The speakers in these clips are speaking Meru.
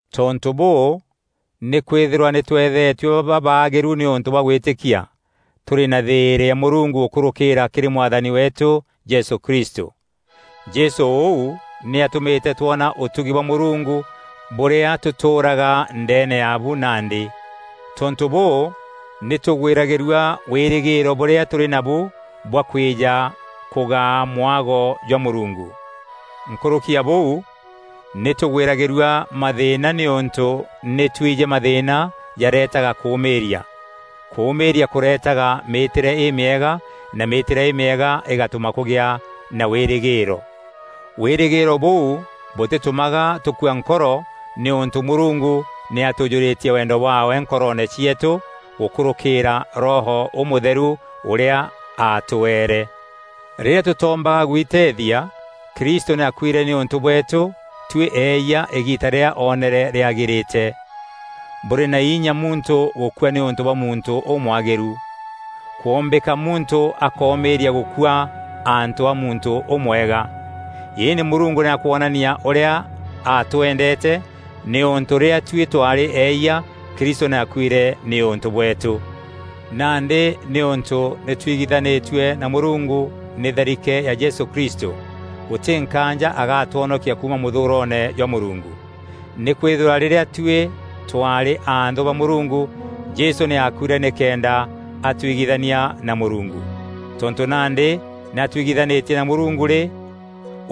Tontû bûû, nîkwîthîrwa nî tûethetue babaagîru nîûntû bwa gwîtîkia, tûrî na thîîrî na Mûrungu gûkûrûkîra kîrî Mwathani weetû Jesû Kristû. Jesû ûu nî atûmîte twona ûtugi bwa Mûrungu bûrîa tûtûûraga ndeene yaabu nandî. Tontû bûû, nî tûgwîragîrua wîrîgîîro bûrîa tûrî nabu bwa kwîja kûgaa mwago jwa Mûrungu. Nkûrûki ya bûu, nî tûgwîragîrua mathîîna nîûntû nî twijî mathîîna jareetaga kûûmîîria, kûûmîîria kûreetaga mîîtîre îmîega, na mîîtîre îmîega îgatûma kûgîa na wîrîgîîro. Wîrîgîîro bûu bûtîtûmaga tûkua nkoro, nîûntû Mûrungu nî atûûjûrîtie wendo bwaawe nkoroone cieetû gûkûrûkîîra Roho Ûmûtheru ûrîa aatweere. Rîrîa tûtoombaga gwiteethia, Kristû nî aakuîre nîûntû bweetû tuî eeyia îgiita rîrîa oneere rîagîrîte. Bûrî na inya muntû gûkua nîûntû bwa muntû ûmwagîru. Kwombîka muntû akoomîîria gûkua antû a muntû ûmwega. Îndî Mûrungu nî akwonania ûrîa aatwendeete, nîûntû rîrîa tuî twaarî eeyia, Kristû nî aakuîre nîûntû bweetû. Nandî nîûntû nî twigithanîtue na Mûrungu nî tharike ya Jesû Kristû, gûtî nkaanja agaatwonokia kuuma mûthûûroone jwa Mûrungu. Nîkwîthîrwa rîrîa tuî twaarî anthû ba Mûrungu, Jesû nî aakuîre nîkenda aatwigithania na Mûrungu. Tontû nandî nî atuigithanîtie na Mûrungu rî,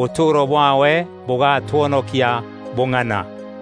ûtûûro bwaawe bûgatwonokia bûng'ana!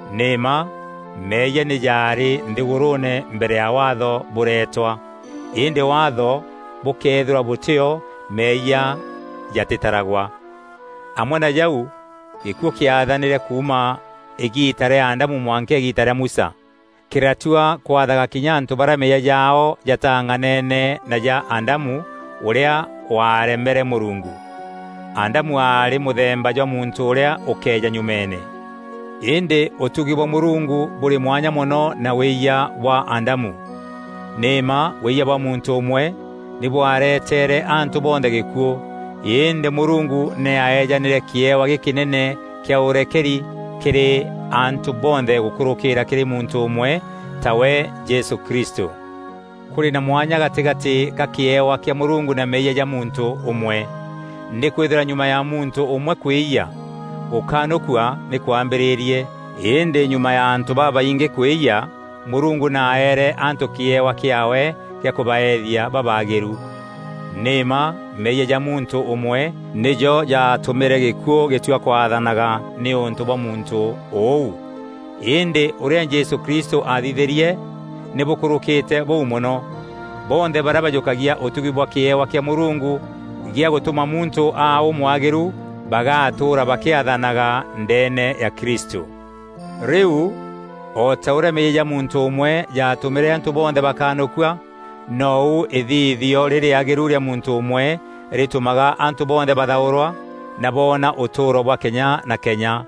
Nî mma meeyia nî jaarî nthîgûrûûne mbere ya Waatho bûretwa, îndî Waatho bûkeethîrwa bûtî o meeyia jatîtaragwa. Amwe na jau gîkuû kîaathanîre kuuma îgiita rîa Adamu mwanka îgiita rîa Musa. Kîratua kwathaga kinya antû barîa meeyia jaao jataang'anene na ja Adamu, ûrîa waaremere Mûrungu. Adamu aarî mûthemba jwa muntû ûrîa ûkeeja nyumeene. Îndî ûtugi bwa Mûrungu bûrî mwanya mono na wîyia bwa Adamu. Nî mma wîyia bwa muntû ûmwe nî bwareteere antû bonthe gîkuû. Îndî Mûrungu nî aaeejanîre kîewa gîkînene kîa ûrekeri kîrî antû bonthe gûkûrûkîra kîrî muntû ûmwe, tawe Jesû Kristû. Kûrî na mwanya gatîgatî ka kîewa kîa Mûrungu na meeyia ja muntû ûmwe. Nîkwîthîrwa nyuma ya muntû ûmwe kwîyia, gûkanûkua nî kwambîrîrie, îndî nyuma ya antû babaingî kwîyia, Mûrungu nî aaere antû kîewa kîaawe kîa kûbaethia babaagîru. Nî mma meeyia ja muntû ûmwe, nîjo jaatûmîre gîkuû gîtua kwaathanaga nîûntû bwa muntû ûu. Îndî ûrîa Jesû Kristû aathithîrie nî bûkûrûkîte bûu mono. Bonthe barîa bajûkagia ûtugi na kîewa kîa Mûrungu gîa gûtûma muntû aa ûmwagîru, bagatûûra bakîathanaga ndeene ya Kristû. Rîu o ta ûrîa meeyia ja muntû ûmwe jaatûmîre antû bonthe bakanûkua, nou îthithio rîrîagîru rîa muntû ûmwe rîtûmaga antû bonthe bathaûrwa na boona ûtûûro bwa kenya na kenya.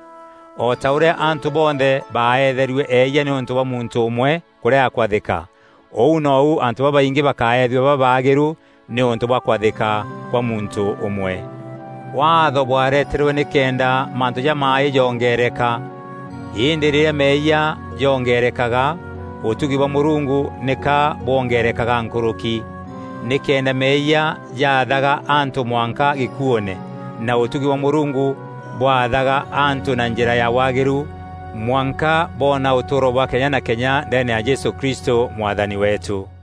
O ta ûrîa antû bonthe baeetherue eeyia nîûntû bwa muntû ûmwe kûrega kwathîka, ûu nou antû babaingî bakaethua babaagîru nîûntû bwa kwathîka kwa muntû ûmwe. Waatho bwareterwe nîkenda mantû jamaaî joongeereka. Îndî rîrîa meeyia joongeerekaga, ûtugi bwa Mûrungu nîka bwongerekaga nkûrûki, nîkenda meeyia jaathaga antû mwanka gîkuûûne, na ûtugi bwa Mûrungu bwaathaga antû na njîra ya waagîru mwanka boona ûtûûro bwa kenya na kenya ndeene ya Jesû Kristû, Mwathani weetû.